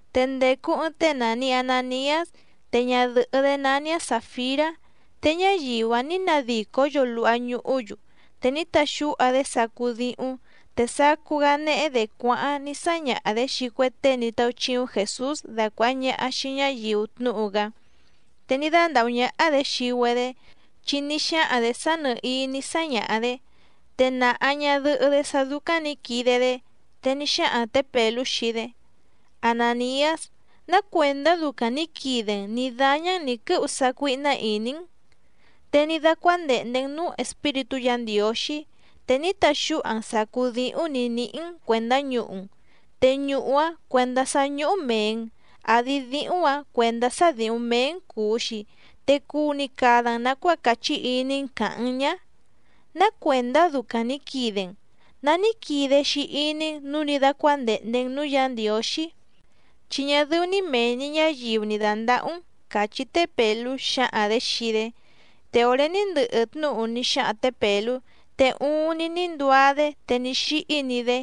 Te ndècu ɨɨⁿ tée nàni Ananiás, te ñadɨ̀hɨ́‑dé nání‑áⁿ Sàfirá, te ñáyiu‑áⁿ nǐ nadìcó‑yu luha ñuhú‑yu. Te ní taxúha‑dé sacú díhúⁿ, te sacú‑gá néhé‑dě cuáháⁿ ní sáñaha‑dě xii cue tée ní táúchíúⁿ Jèsús dacuàha ñaha xii ñáyiu tnúhu‑gá, te ní dándàhú ñáhá‑dě xii‑güedé, chi ní xáhaⁿ‑dě sá nɨ̀hií ní sáñaha‑dě, te nàha ñadɨhɨ́‑dé sá dúcáⁿ nǐ quide‑dé. Te ní xáhaⁿ tě Pèlú xii‑dé: —Anàniás, ¿ná cuèndá ducaⁿ nǐ quide‑n nǐ dáñá‑n nǐ quɨ́hu sácuíhná ìní‑n? Te ní dácuándèhnde‑n núú Espíritú Yǎ Ndiǒxí, te ní taxúha‑n sàcú díhúⁿ nǐ níhí‑n cuèndá ñuhu‑n. ¿Te ñuhu‑áⁿ cuèndá sá ñúhú mèe‑n, àdi díhúⁿ‑ǎⁿ cuèndá sá dǐhúⁿ méé‑n cùu‑xi, te cuu‑ni cada‑n nàcuáa càchí iní‑n càhaⁿ‑n ñá? ¿Ná cuèndá ducaⁿ nǐ quide‑n? ¿Ná ní quide‑xi iní‑n nǔu ní dácuándèhnde‑n núú Yǎ Ndiǒxí? Chi ñá dɨ́ú‑ní mèe‑ni ñáyiu ni dàndahú‑n —càchí té Pèlú xǎhaⁿ‑dě xii‑dé. Te òré ní ndɨhɨ tnúhu ní xáhaⁿ tě Pèlú, te uuⁿni ní nduá‑dé te ní xíhí‑ni‑dé.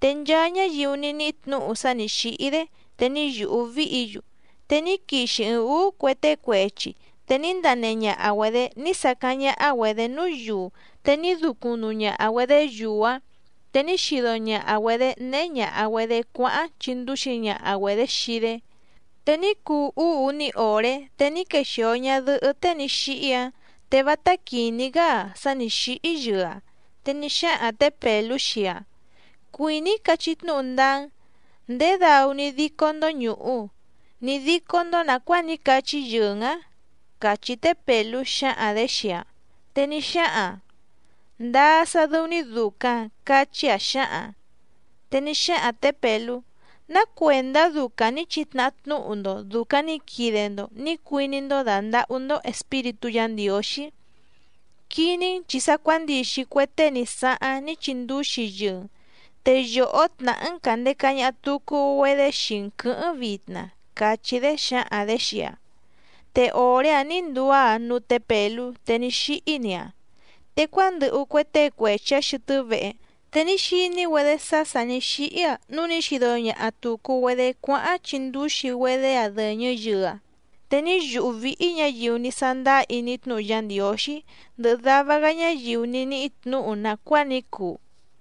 Te nchaa ñáyiu ní níhí tnǔhu sá nǐ xíhí‑dé, te ní yùhú víhǐ‑yu. Te ní quixi ɨɨⁿ ǔú cue tée cuechi, te ní ndanehe ñaha‑güedě ní sacáⁿ ñáhá‑güedě núú yuu, te ní ducuⁿ nuu ñaha‑güedě yuu‑áⁿ, te ní xido ñaha‑güedě néhé ñàha‑güedé cuáháⁿ chìndúxi ñaha‑güedě xii‑dé. Te ní cuu úú uní òré, te ní quexìo ñadɨhɨ́ tée ní xíhí‑áⁿ, te vátá quìní‑gá‑aⁿ sá nǐ xíhí yɨɨ‑aⁿ. Te ní xáhaⁿ tě Pèlú xii‑aⁿ: —Cuìní‑í cachí tnúhu ndáá‑n. ¿Ndědau ní dícó‑ndó ñùhu, ní dícó‑ndó nàcuáa ní cachí yɨɨ‑n ǎⁿ? —càchí té Pèlú xǎhaⁿ‑dě xii‑aⁿ. Te ní xáhaⁿ‑aⁿ: —Ndáá sá dɨ́ú‑ní dùcaⁿ —cachí‑aⁿ xǎhaⁿ‑aⁿ. Te ní xáhaⁿ tě Pèlú: —¿Ná cuèndá ducaⁿ nǐ chitnàha tnúhu‑ndo dùcaⁿ ní quide‑ndo nǐ cuiní‑ndó dàndahú‑ndó Espíritú Yǎ Ndiǒxí? Quiní‑n, chi sa cuándixi cue tée ní sáháⁿ ní chindúxi yɨɨ‑n, te yòhó tnàhá‑n càndeca ñaha tucu‑güedé xii‑n quɨ̌hɨ́ⁿ vitna —càchí‑dé xǎhaⁿ‑dě xii‑aⁿ. Te òré‑áⁿ nǐ nduá‑aⁿ núú tě Pèlú, te ní xíhí‑ni‑aⁿ. Te cuándɨhu cue tée cuechi‑ǎⁿ xɨtɨ́ vehe, te ní xiní‑güedé sá sà ní xíhí‑aⁿ, núu ní xido ñaha tùcu‑güedé cuáháⁿ chindúxi‑güedé‑aⁿ dɨ̀ñɨ yɨɨ‑aⁿ. Te ní yùhú víhí ñǎyiu ní sándáá iní tnúhu Yá Ndiǒxí, ndɨhɨ dava‑gá ñáyiu ní níhí tnǔhu nàcuáa ní cuu.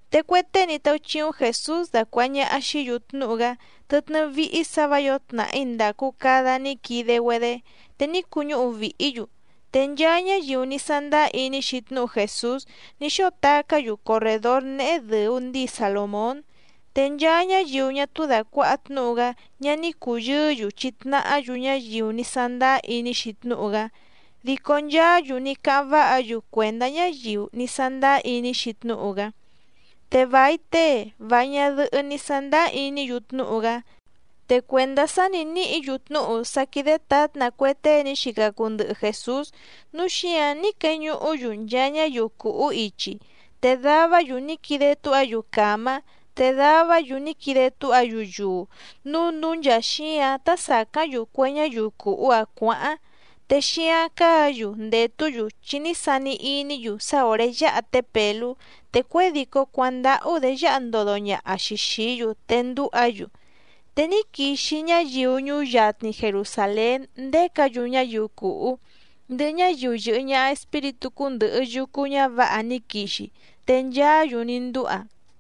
Te cue tée ní táúchíúⁿ Jèsús dacuàha ñaha xií‑yu tnúhu‑gá tɨtnɨ́ víhí sǎ vǎ yǒo tnàhí ndàcu cada ní quide‑güedé, te ní cuñúhu vìhí‑yu. Te nchaa ñáyiu ní sándáá iní‑xi tnúhu Jèsús ní xóo tacá‑yu corrèdór néhé dɨ̀u ndíi Salòmón. Te nchaa ñáyiu ñá túú dàcuaha tnúhu‑gá ñá ní cùyɨɨ́‑yu chitnahá‑yu ñáyiu ní sándáá iní‑xi tnúhu‑gá, dico nchaá‑yu ní cáháⁿ váha‑yu cuèndá ñáyiu ní sándáá iní‑xi tnúhu‑gá. Te vài tée, vài ñadɨhɨ́ ní sándáá iní‑yu tnúhu‑gá. Te cuèndá sá nǐ níhǐ‑yu tnúhu sá quídé tǎtna cue tée ní xica cuu ndɨhɨ Jèsús, núu xíǎⁿ ní queñuhú‑yu nchaa ñáyiu cùhú ichi, te davá‑yu ní quide túha‑yu càmá te davá‑yu ní quide túha‑yu yuu, núu núú nchàa xíǎⁿ tá sàcáⁿ‑yu cue ñáyiu cùhú‑áⁿ cuǎháⁿ, te xíáⁿ cáǎ‑yu ndètú‑yu, chi ní sani iní‑yu sá òré yáha té Pèlú te cuědìcó cuándáhú‑dě yáha ndodo ñaha‑xi xìí‑yu te ndúha‑yu. Te ní quixi ñáyiu ñuú yatni Jerusàlén ndécǎ‑yu ñáyiu cùhú, ndɨhɨ ñáyiu yɨ̀hɨ ñaha espíritú cúndɨ̀hɨ yucu ñávǎha ní quixi, te nchaá‑yu ní ndúha.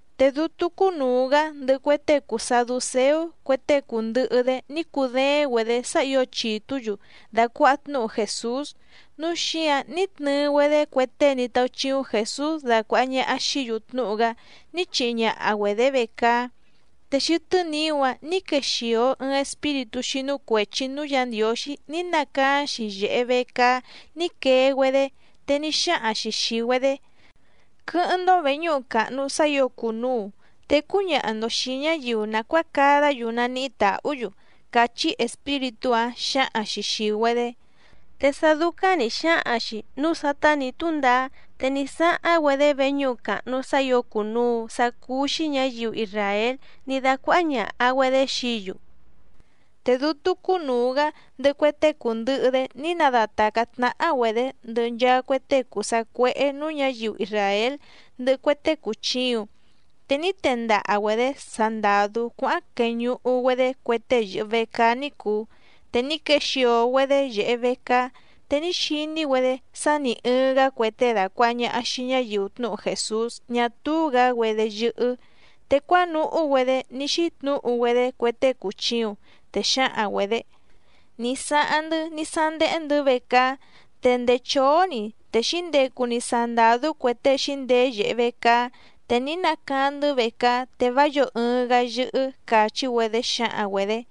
Te dútú cúnùu‑gá ndɨhɨ cue tée cùu saducéú cue tée cùndɨhɨ‑dé ní cudééⁿ‑güedě sá ǐo chìtú‑yu dàcuaha tnúhu Jèsús, núu xíǎⁿ ní tnɨɨ‑güedé cue tée ní táúchíúⁿ Jèsús dacuàha ñaha xií‑yu tnúhu‑gá ní chihi ñaha‑güedě vecaá. Te xɨtɨ́ niú‑áⁿ nǐ quexìo ɨɨⁿ espíritú xínú cuèchi núú Yǎ Ndiǒxí ní nacaáⁿ‑xi yèhe vecaá ní quee‑güedé, te ní xáhaⁿ‑xi xìi‑güedé: —Quɨ́hɨ́ⁿ‑ndó vèñúhu càhnu sá ǐo cùnuu te cúñaha‑ndo xìi ñáyiu nàcuáa cadá‑yu naníhí tàhú‑yu —càchí espíritú‑áⁿ xǎhaⁿ‑xi xìi‑güedé. Te sá dúcáⁿ nǐ xáhaⁿ‑xi nǔu sátá nǐ túndaá, te ní sáháⁿ‑güedé veñúhu càhnu sá ǐo cùnuu sá cúú‑xí ñǎyiu isràél ní dácuáhá ñàha‑güedé xií‑yu. Te dútú cúnùu‑gá ndɨhɨ cue tée cùndɨhɨ‑dé ní nadatàcá tnáhá‑güedě ndɨhɨ nchaa cue tée cùu sacuéhé nǔú ñǎyiu isràél ndɨhɨ cue tée cùchiuⁿ, te ní tendaha‑güedě sandàdú cuáháⁿ queñuhu‑güedé cue tée yɨ̀hɨ vecaá ní cùu. Te ní quexìo‑güedé yèhe vecaá, te ní xiní‑güedé sá nì ɨɨⁿ‑gá cue tée dàcuaha ñaha xii ñáyiu tnúhu Jèsús ñá túú‑gǎ‑güedé yɨ́hɨ́. Te cuánuhú‑güedé ní xítnǔhu‑güedé cue tée cùchiuⁿ, te xǎhaⁿ‑güedě: —Ní sáháⁿ‑ndɨ́ ní sándéhé‑ndɨ̌ vecaá, te ndèé chóó‑ni, te xǐndecu‑ni sandàdú cue tée xǐndeé yèhe vecaá. Te ní nacaáⁿ‑ndɨ́ vecaá, te vá yǒo ɨɨⁿ‑gá yɨ́hɨ́ —càchí‑güedé xǎhaⁿ‑güedě.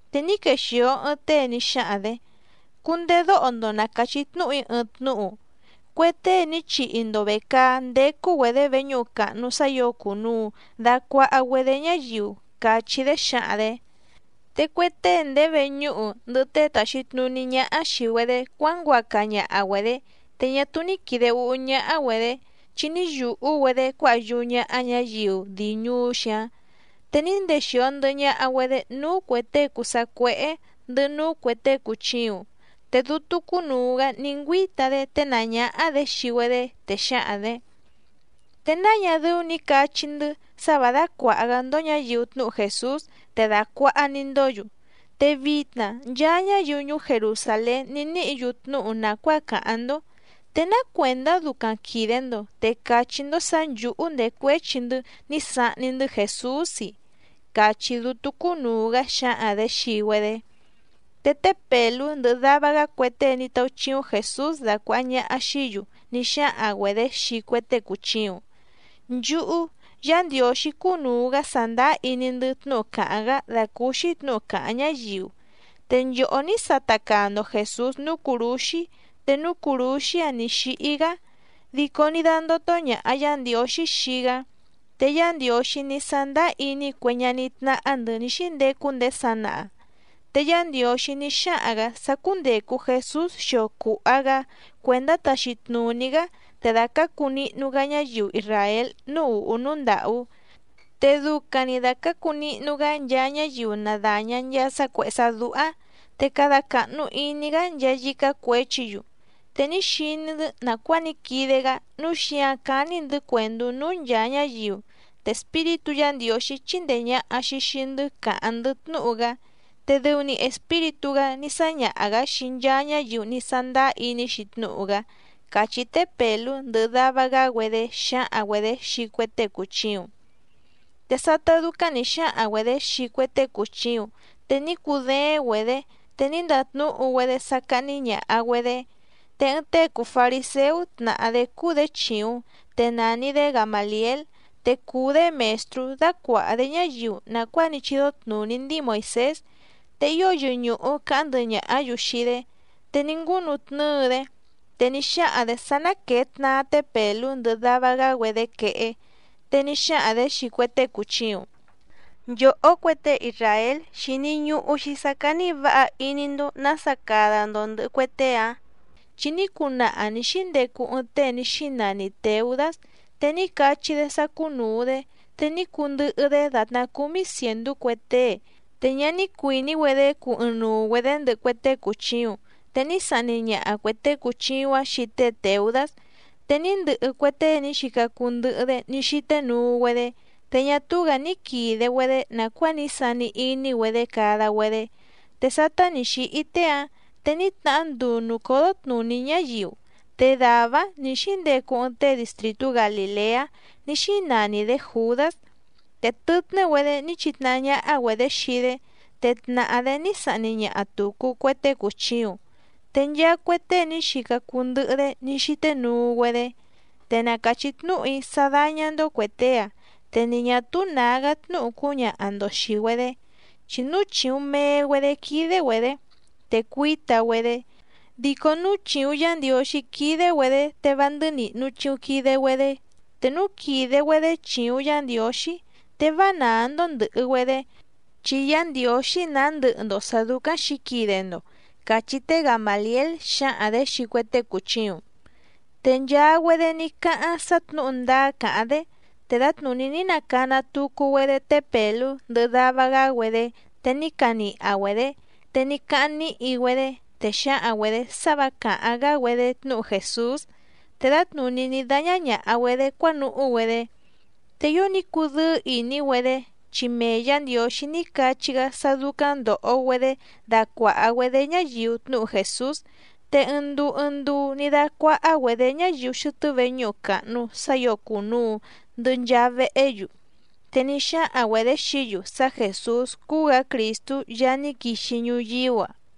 Te ní quexìo ɨɨⁿ tée ní xáhaⁿ‑dě: —Cundedóho‑ndo na càchí tnúhu‑í ɨɨⁿ tnúhu. Cue tée ní chihi‑ndo vècaá ndécú‑güedě veñúhu càhnu sá ǐo cùnuu dacuaha‑güedé ñáyiu —càchí‑dé xǎhaⁿ‑dě. Te cue tée ndèé veñúhu ndɨhɨ tée tàxi tnuní ñáhá xìi‑güedé cuánguaca ñaha‑güedě, te ñá túú ní quìde úhú ñáhá‑güedě, chi ní yùhú‑güedé cuáha yúú ñáhá ñǎyiu dii ñùú‑xi‑áⁿ. Te ní ndexìo ndɨhɨ ñaha‑güedé núú cuè tée cùu sacuéhé ndɨhɨ núú cuè tée cùchiuⁿ. Te dútú cúnùu‑gá ní ngüíta‑dé ténàá ñáhá‑dě xii‑güedé, te xǎhaⁿ‑dě: —Te náa ñá dɨ́ú nǐ cachí‑ndɨ́ sá vǎ dácuàha‑gá‑ndó ñǎyiu tnúhu Jèsús te dàcuaha‑ni‑ndó‑yu, te vitna nchaa ñáyiu ñuú Jerusàlén ní níhǐ‑yu tnúhu nàcuáa càháⁿ‑ndó. ¿Te ná cuèndá ducaⁿ quìde‑ndo, te càchí‑ndó sǎ nchǔhú ndècuéchi‑ndɨ́ ní sahni‑ndɨ́ Jèsús‑i? —càchí dútú cúnùu‑gá xǎhaⁿ‑dě xii‑güedé. Te té Pèlú ndɨhɨ dava‑gá cue tée ní táúchíúⁿ Jèsús dacuàha ñaha xií‑yu ní xáhaⁿ‑güedě xii cue tée cùchiuⁿ: —Nchúhú, Yá Ndiǒxí cúnùu‑gá sàndáá iní‑ndɨ́ tnúhu càháⁿ‑gá dàcúúxí tnǔhu càháⁿ ñáyiu. Te nchòhó ní sata caa‑ndo Jèsús núú cùrúxí te núú cùrúxí‑áⁿ nì xíhí‑gá, dico ní dándótó ñàha Yá Ndiǒxí xii‑gá. Te Yá Ndiǒxí ní sándáá iní cue ñaní tnáhá‑ndɨ̌ ní xíndecu ndéé sanaha. Te Yá Ndiǒxí ní xáhaⁿ‑gǎ sá cúndècu Jesús xio cùha‑gá cuèndá taxi tnùní‑gá te dacǎcu nihnu‑gá ñáyiu isràél núú ùhú núú ndàhú. Te ducaⁿ‑ni dacǎcu nihnu‑gá nchaa ñáyiu na dàña nchaa sá cuèhé sá dúhá, te cada càhnu iní‑gá nchaa yícá cuěchi‑yu. Te ní xiní‑ndɨ́ nàcuáa ní quide‑gá, núu xíǎⁿ cání‑ndɨ̌ cuèndú núú nchàa ñáyiu, te Espíritú Yǎ Ndiǒxí chíndèe ñaha‑xi xii‑ndɨ́ càháⁿ‑ndɨ́ tnúhu‑gá. Te dɨu‑ni Espíritú‑gá ní sáñaha‑gǎ xii nchaa ñáyiu ní sándáá iní‑xi tnúhu‑gá —càchí té Pèlú ndɨhɨ dava‑gá‑güedé xǎhaⁿ‑güedě xii cue tée cùchiuⁿ. Te sátá dúcáⁿ nǐ xáhaⁿ‑güedě xii cue tée cùchiuⁿ, te ní cudééⁿ‑güedě, te ní ndatnúhu‑güedé sá cáhní ñàha‑güedé. Te ɨɨⁿ tée cùu fariséú tnàha‑dé cúú‑dě chìuⁿ, te nàni‑dé Gamàliél, te cùu‑dé mèstrú dácuàha‑dé ñáyiu nàcuáa ní chídó tnùní ndíi Moìsés, te ío yɨñùhu caháⁿ ndɨhɨ ñàhá‑yu xii‑dé. Te ní ngúnutnɨ́ɨ‑dé, te ní xáhaⁿ‑dě sá ná quèe tnaa té Pèlú ndɨhɨ dava‑gá‑güedé quehé. Te ní xáhaⁿ‑dě xii cue tée cùchiuⁿ: —Nchòhó cue tée isràél, xìni ñuhu‑xi sá cání vǎha iní‑ndó nǎsa cada‑ndo ndɨ̀hɨ cue tée‑ǎⁿ. Chi ní cunaha nǐ xíndecu ɨɨⁿ tée ní xínani Tèudás, te ní cachí‑dé sá cúnùu‑dé, te ní cundɨhɨ‑dé dàtná cúmí cièndú cue tée, te ñá ní cuìní‑güedé cuu ɨɨⁿnuu‑güedě ndɨhɨ cue tée cùchiuⁿ. Te ní sahni ñaha cuè tée cùchiuⁿ‑áⁿ xii tée Tèudás, te ní ndɨhɨ cue tée ní xica cuu ndɨhɨ‑dé ní xíté nuu‑güedé, te ñá túú‑gǎ ní quìde‑güedé nàcuáa ní sani iní‑güedé cada‑güedé. Te sátá nì xíhí tée‑áⁿ, te ní tnahá nduu nùcódó tnùní ñáyiu. Te dàvá‑áⁿ nǐ xíndecu ɨɨⁿ tée distrìtú Galìleá ní xínani‑dě Jùdás. Te tɨtnɨ́‑güedé ní chitnahá ñáhá‑güedě xii‑dé. Te tnàhá‑dé ní sahni ñaha tùcu cue tée cùchiuⁿ, te nchaa cue tée ní xica cuu ndɨhɨ‑dé ní xíté nuu‑güedé. Te na càchí tnúhu‑í sá dáñá‑ndó cuè tée‑áⁿ, te ni ñà túú nǎgá tnúhu cúñaha‑ndo xìi‑güedé, chi núu chìuⁿ mee‑güedé quídé‑güedě te cuíta‑güedé, dico núu chìuⁿ Yá Ndiǒxí quídé‑güedě, te vá ndɨ́nìhnu chiuⁿ quide‑güedé. Te núu quìde‑güedé chìuⁿ Yá Ndiǒxí, te vá nàá‑ndó ndɨ̀hɨ‑güedé, chi Yá Ndiǒxí nàá ndɨhɨ‑ndo sǎ dúcáⁿ xǐquide‑ndo —càchí té Gamàliél xǎhaⁿ‑dě xii cue tée cùchiuⁿ. Te nchaa‑güedé ní cáháⁿ sá tnǔhu ndáá càháⁿ‑dé. Te dǎtnùní ní nacana tucu‑güedé té Pèlú ndɨhɨ dava‑gá‑güedé te ní caniha‑güedě, te ní cáháⁿ níhi‑güedé, te xǎhaⁿ‑güedě sá vǎ càháⁿ‑gá‑güedé tnúhu Jèsús, te dǎtnùní ní dáñá ñàha‑güedé cuánuhú‑güedé. Te ío ní cudɨ́ɨ́ ìní‑güedé, chi mee Yǎ Ndiǒxí ní cachí‑gá sá dúcáⁿ ndòho‑güedé dacuàha‑güedé ñáyiu tnúhu Jèsús. Te ɨɨⁿ nduu ɨɨⁿ nduu ní dácuáhá‑güedě ñáyiu xɨtɨ́ veñúhu càhnu sá ǐo cùnuu ndɨhɨ nchaa vehé‑yu. Te ní xáhaⁿ‑güedě xií‑yu sá Jèsús cúú‑gǎ Crìstú Yaá ní quixi ñuyíú‑a.